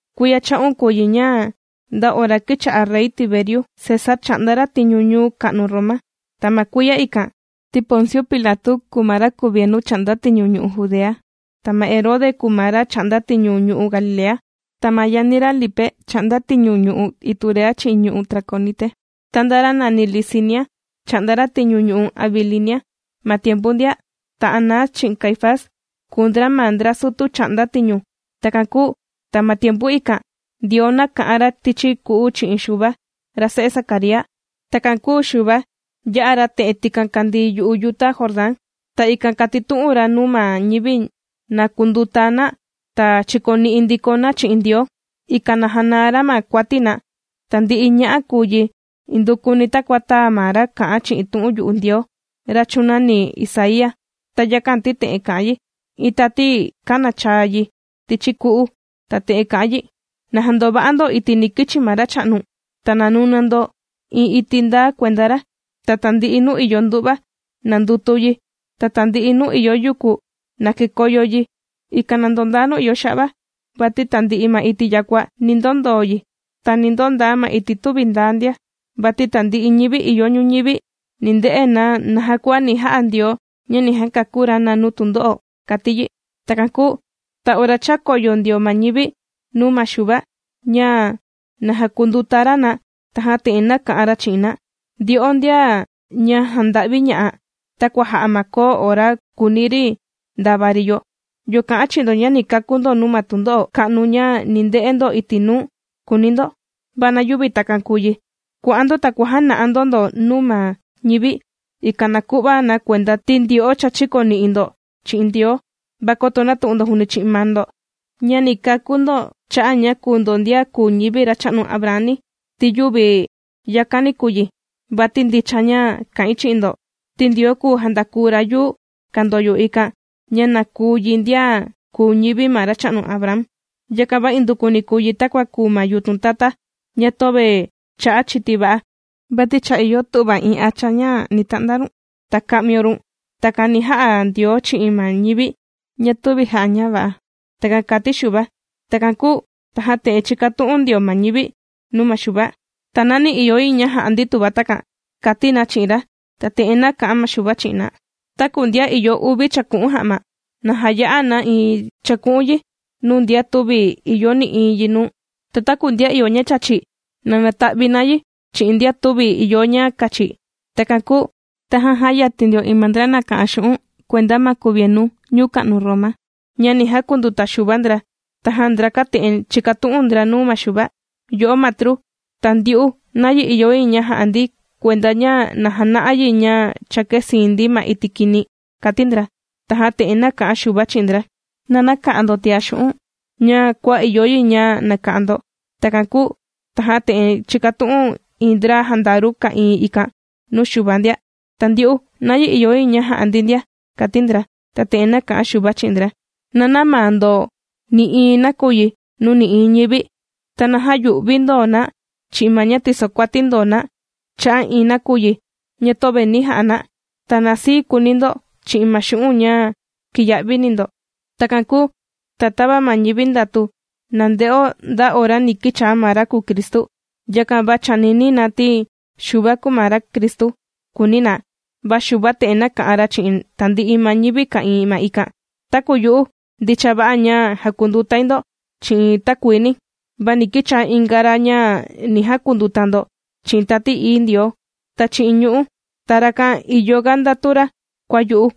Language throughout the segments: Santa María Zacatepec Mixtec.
Kuiya cha'un kùu yi ña nda ora kīcha'a Rey Tiberio César chà'nda ra tiñu ñuu ka'nu Roma. Ta ma kuiya ikan ti Ponciu Pilatu, kūu ma ra kuvienu chà'nda tiñu ñu'u' Judea. Ta ma Herode kùu ma ra chà'nda tiñu ñu'u' Galilea. Ta ma yani ra Lipe chà'nda tiñu ñu'u' Iturea chi'in ñu'u' Traconite, ta ndaa ra nàni Lisinia chà'nda ra tiñu ñu'u' Abilinia ma tiempu ikan ndia. Ta Anás chi'in Caifás, kùu ndra ma ndra sutu chà'nda tiñu. Takan kūu ta ma tiempu ikan, Ndioo nāka'an ra tichi ku'u chi'in Xuva, ra se'e Zacaría. Takan kūu Xuva, yā'a ra te'en tikan kàndii yu'u yuta Jordán. Ta ikan kàtitu'un ra nuu ma ñivi na kunduta na ta chikoni'i ndiko na chi'in Ndioo, ikan na janaa ra ma kuati na. Tandi'i ña'a' kūu yi indukuni takua tāa ma ra kā'an chi'in tu'un yu'u Ndioo, ra chūnani Isaía. Ta yakan, ti te'en kà'an yi: Iin tati kānachaa yi tichi ku'u ta te'en kà'an yi: “Na jandova'a ndo iti' ni kichi ma Racha'nu, ta na nuna ndo iin iti' ndaa kuenda ra. Ta tandi'i nuu ìyo ndu'va, na ndutu yi, ta tandi'i nuu ìyo yuku na kekoyo yi, ikan na ndondaa nuu ìyo xa'va, vati tandi'i ma iti' yakua ni ndondoo yi. Ta ni ndondaa ma iti' tüvi ndaa ndia. Vati tandi'i ñivi ìyo ñuñivi ni nde'e na naja kua ni ja'a Ndioo ña ni jakakú ra na nuu tundo'o”, kàti yi. Takan kūu ta ora chākoyo ndio ma ñivi nuu ma Xuva ña, na jakunduta ra na, tajan te'en nāka'an ra chi'in na: ―Ndyo'o ndian jànda'viña'a takua jà'a ma koo ora kùuni ri ndava ri yo, ¿yo kà'an chi'in ndo ña ni kakú ndo nuu ma tundo'o ka'nu ña ni nde'e ndo iti' nuu?, kùuni ndo. Va na yüvi takan kùu yi. Kua'an ndo, ta kuàjana'a ndo ndo nuu ma ñivi, ikan na ku'va na kuenda ti ndyo'o cha chīkoni'i ndiko ndo chi'in Ndioo, va koto nätu'un ndo juuni chi'in maa ndo ña ni kakú ndo cha'a' ña kùu ndo ndian kùu ñivi ma racha'nu Abraham ni, ¡ti yüvi yakani kùu yi! Vati ndicha ña kà'in chi'in ndo, ti Ndioo kùu jandaku ra yuu kàndoyo ikan, ña na kuu yi ndian kùu ñivi ma racha'nu Abraham. Yakan va indukuni kùu yi takua kùu ma yutun tata ña töve chà'a chiti va'a, vati cha ìyo tu'va iin hacha ña ni ta'nda run, ta ka'mio run. Takan ni ja'a Ndioo chi'in ma ñivi ña tüvi jà'a ña va'a. ―Takan kāti Xuva. Takan kūu tajan te'en chīkatu'un ndio ma ñivi nuu ma Xuva: ―¿Ta nayi ìyo yi ña ja'a ndi tuva takan? ―kàti na chi'in ra. Ta te'en nāka'an ma Xuva chi'in na: ―Taku ndian ìyo uvi chàku'un ja'ma, na jaya'a na iin chàku'un yi nuu ndian tüvi ìyo nï'iin yi nuu. Ta taku ndian ìyo ña chàchi, na nata'vi na yi chi'in ndian tüvi ìyo ña kachi. Takan kūu tajan jāyatin ndio iin ma ndra nàka'an xu'un' kuenda ma kuvienu ñuu ka'nu Roma, ña ni jakunduta Xuva ndra. Tajan ndrakan te'en chīkatu'un ndra nuu ma Xuva: ―Yo'o Matru, ¿ta ndyu'u, nayi ìyo yi ña ja'a ndi kuenda ña na jana'a yi ña cha kēsiin ndi ma iti' kini? ―kàti ndra. Tajan te'en nāka'an Xuva chi'in ndra: ―Na näka'an ndo tiá xu'un' ña kua ìyo yi ña naka'an ndo. Takan kūu tajan te'en chīkatu'un iin ndra jandaru ka'ìin ikan nuu Xuva ndia: ―Ta ndyu'u, ¿nayi ìyo yi ña ja'a ndi ndia? ―kàti ndra. Ta te'en nāka'an Xuva chi'in ndra: ―Na nämaa ndo nï'iin nakuyi nuu nï'iin ñivi, ta na jäyu'vi ndo na chi'in ma ña tisokuati ndo na cha'a' iin nakuyi ña tüvi nī ja'a na. Ta na sii kuuni ndo chi'in ma xu'un' ña kìya'vini ndo. Takan kūu ta tava ma ñivi ndàtu na nde'o nda ora ni kìchaa ma ra kùu Cristu, yakan va chànini na ti Xuva kùu ma ra Cristu, kùuni na. Va Xuva te'en nāka'an ra chi'in tandi'i ma ñivi ka'ìin ma ikan: ―Taku yu'u ndicha va'a ña jàkundutai ndo chi'in takuini, va ni kichaa inga ra ña ni jakunduta ndo chi'in Tati Ií Ndioo, ta chi'in ñu'ú. Ta rakan ìyoga ndatu ra kua yu'u,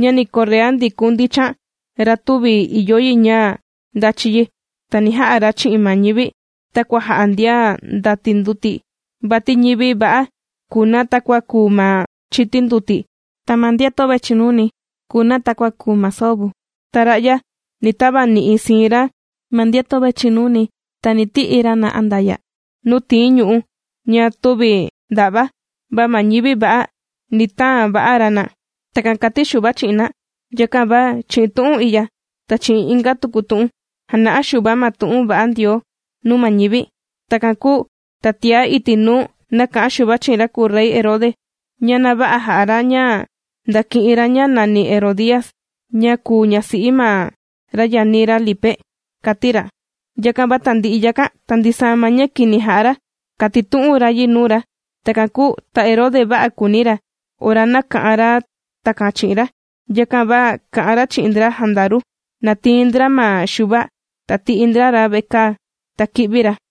ña ni korrea ndikun ndichan ra tüvi ìyo yi ña ndachi yi. Ta ni ja'a ra chi'in ma ñivi takua jà'a ndian ndàti nduti. Vati ñivi va'a kùu na takua kùu ma chiti nduti, ta ma ndian töve chìnuni kùu na takua kùu ma soo vu. Ta ra'ya ni tavani'i siin ra ma ndian töve chìnuni ta ni ti'i ra na andaya' nuu tìin ñu'ú ña tüvi nda'va, va ma ñivi va'a ni taan va'a ra na. ―Takan kàti Xuva chi'in na. Yakan va chi'in tu'un i'ya, ta chi'in inga tuku tu'un jàna'a Xuva ma tu'un va'a Ndioo nuu ma ñivi. Takan kūu ta tiá iti' nuu nāka'an Xuva chi'in ra kùu rey Herode ña na vä'a jà'a ra ña ndāki'in ra ña nàni Herodías ña kùu ñasi'i ma ra yani ra Lipe, kàti ra. Yakan va tandi'i yakan, ta ndisaa ma ña kini jā'a ra kātitu'un ra yi nuu ra. Takan kūu ta Herode vä'a kūuni ra ora nāka'an ra takan chi'in ra, yakan va kà'an ra chi'in ndra jandaru, na tiin ndra ma Xuva ta ti'i ndra ra vekaa, ta kī'vi ra.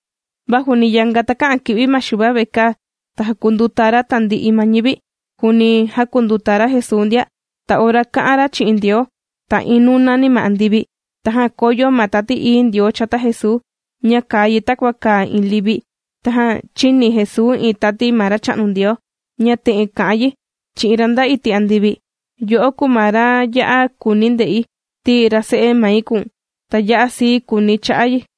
Va juuni yanga takä'an kì'vi ma Xuva vekaa, ta jākunduta ra tandi'i ma ñivi, juuni jākunduta ra Jesuu ndia. Ta ora kà'an ra chi'in Ndioo, ta iin nūnani ma andivi. Tajan kōyo ma Tati Ií Ndioo chata Jesuu, ña kàa yi takua kàa iin livi, tajan chīni Jesuu iin tati ma Racha'nu Ndioo ña te'en kà'an yi chi'in ra nda iti' andivi: ―Yo'o kùu ma ra ya'a kùuni̱ nde'i, ti ra se'e mai kùu̱n. Ta ya'a sii kùuni̱ cha'a' yi.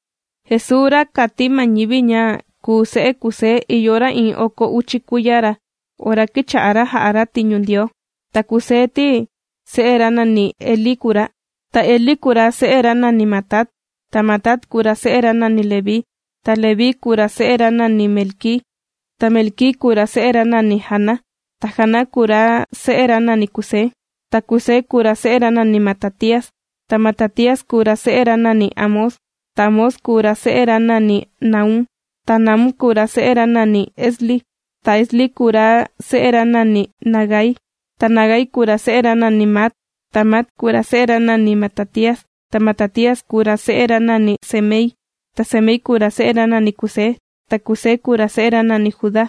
Jesuu, ra kàti ma ñivi ña kùu se'e Kusé ìyo ra iin oko uchi kuiya ra ora kīcha'a ra jà'a ra tiñu Ndioo. Ta Kusé ti, se'e ra nàni Elí kùu ra. Ta Elí kùu ra se'e ra nàni Matat. Ta Matat kùu ra se'e ra nàni Leví. Ta Leví kùu ra se'e ra nàni Melquí. Ta Melquí kùu ra se'e ra nàni Jana. Ta Jana kùu ra se'e ra nàni Kusé. Ta Kusé kùu ra se'e ra nàni Matatías. Ta Matatías, kùu ra se'e ra nàni Amós. Ta Amós kùu ra se'e ra nàni Nahúm. Ta Nahúm kùu ra se'e ra nàni Esli. Ta Esli, kùu ra se'e ra nàni Nagai. Ta Nagai, kùu ra se'e ra nàni Maat. Ta Maat kùu ra se'e ra nàni Matatías. Ta Matatías, kùu ra se'e ra nàni Semei. Ta Semei, kùu ra se'e ra nàni Kusé. Ta Kusé, kùu ra se'e ra nàni Judá.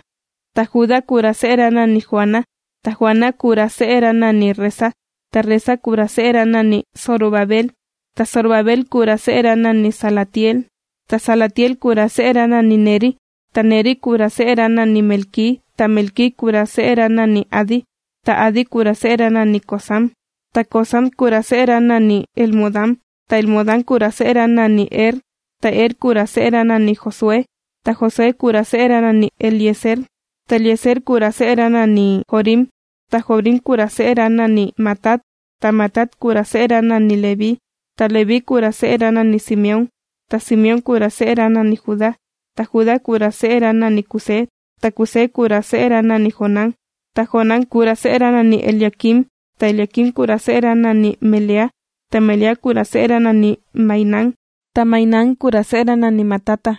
Ta Judá, kùu ra se'e ra nàni Joana. Ta Joana, kùu ra se'e ra nàni Resa. Ta Resa, kùu ra se'e ra nàni Zorobabel. Ta Zorobabel, kùu ra se'e ra nàni Salatiel. Ta Salatiel, kùu ra se'e ra nàni Neri. Ta Neri, kùu ra se'e ra nàni Melquí. Ta Melquí, kùu ra se'e ra nàni Adi. Ta Adi, kùu ra se'e ra nàni Cosam. Ta Cosam, kùu ra se'e ra nàni Elmodam. Ta Elmodam, kùu ra se'e ra nàni Er. Ta Er, kùu ra se'e ra nàni Josué. Ta Josué, kùu ra se'e ra nàni Eliezer. Ta Eliezer, kùu ra se'e ra nàni Jorim. Ta Jorim, kùu ra se'e ra nàni Matat. Ta Matat, kùu ra se'e ra nàni Leví. Ta Leví, kùu ra se'e ra nàni Simeón. Ta Simeón, kùu ra se'e ra nàni Judá. Ta Judá, kùu ra se'e ra nàni Kusé. Ta Kusé, kùu ra se'e ra nàni Jonán. Ta Jonán, kùu ra se'e ra nàni Eliaquim. Ta Eliaquim, kùu ra se'e ra nàni Melea. Ta Melea, kùu ra se'e ra nàni Mainán. Ta Mainán, kùu ra se'e ra nàni Matata.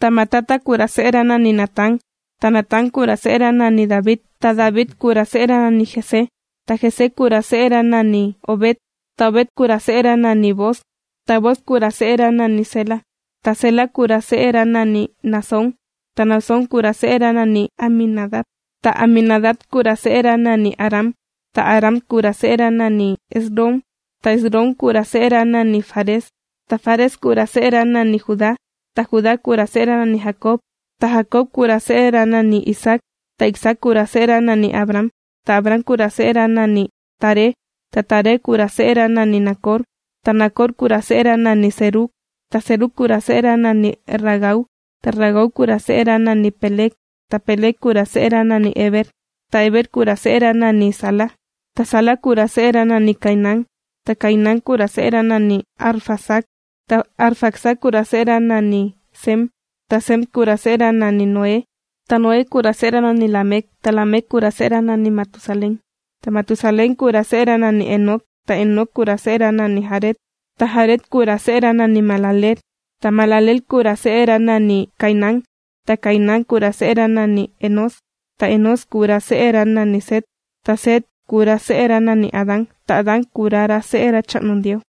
Ta Matata kùu ra se'e ra nàni Natán. Ta Natán, kùu ra se'e ra nàni David. Ta David, kùu ra se'e ra nàni Isaí. Ta Isaí, kùu ra se'e ra nàni Obed. Ta Obed, kùu ra se'e ra nàni Booz. Ta Booz, kùu ra se'e ra nàni Sélah. Ta Sélah kùu ra se'e ra nàni Naasón. Ta Naasón, kùu ra se'e ra nàni Aminadab. Ta Aminadab, kùu ra se'e ra nàni Aram. Ta Aram, kùu ra se'e ra nàni Esrom. Ta Esrom, kùu ra se'e ra nàni Fares. Ta Fares, kùu ra se'e ra nàni Judá. Ta Judá, kùu ra se'e ra nàni Jacob. Ta Jacob, kùu ra se'e ra nàni Isaac. Ta Isaac, kùu ra se'e ra nàni Abraham. Ta Abraham, kùu ra se'e ra nàni Taré. Ta Taré, kùu ra se'e ra nàni Nacor. Ta Nacor, kùu ra se'e ra nàni Serug. Ta Serug, kùu ra se'e ra nàni Ragau. Ta Ragau, kùu ra se'e ra nàni Peleg. Ta Peleg, kùu ra se'e ra nàni Heber. Ta Heber, kùu ra se'e ra nàni Sala. Ta Sala, kùu ra se'e ra nàni Cainán. Ta Cainán, kùu ra se'e ra nàni Arfaxad. Ta Arfaxad, kùu ra se'e ra nàni Sem. Ta Sem, kùu ra se'e ra nàni Noé. Ta Noé, kùu ra se'e ra nàni Lamec. Ta Lamec, kùu ra se'e ra nàni Matusalén. Ta Matusalén, kùu ra se'e ra nàni Enoc. Ta Enoc, kùu ra se'e ra nàni Jared. Ta Jared kùu ra se'e ra nàni Mahalaleel. Ta Mahalaleel kùu ra se'e ra nàni Cainán. Ta Cainán kùu ra se'e ra nàni Enós. Ta Enós, kùu ra se'e ra nàni Set. Ta Set, kùu ra se'e ra nàni Adán. Ta Adán kùu ra, ra se'e Racha'nu Ndioo.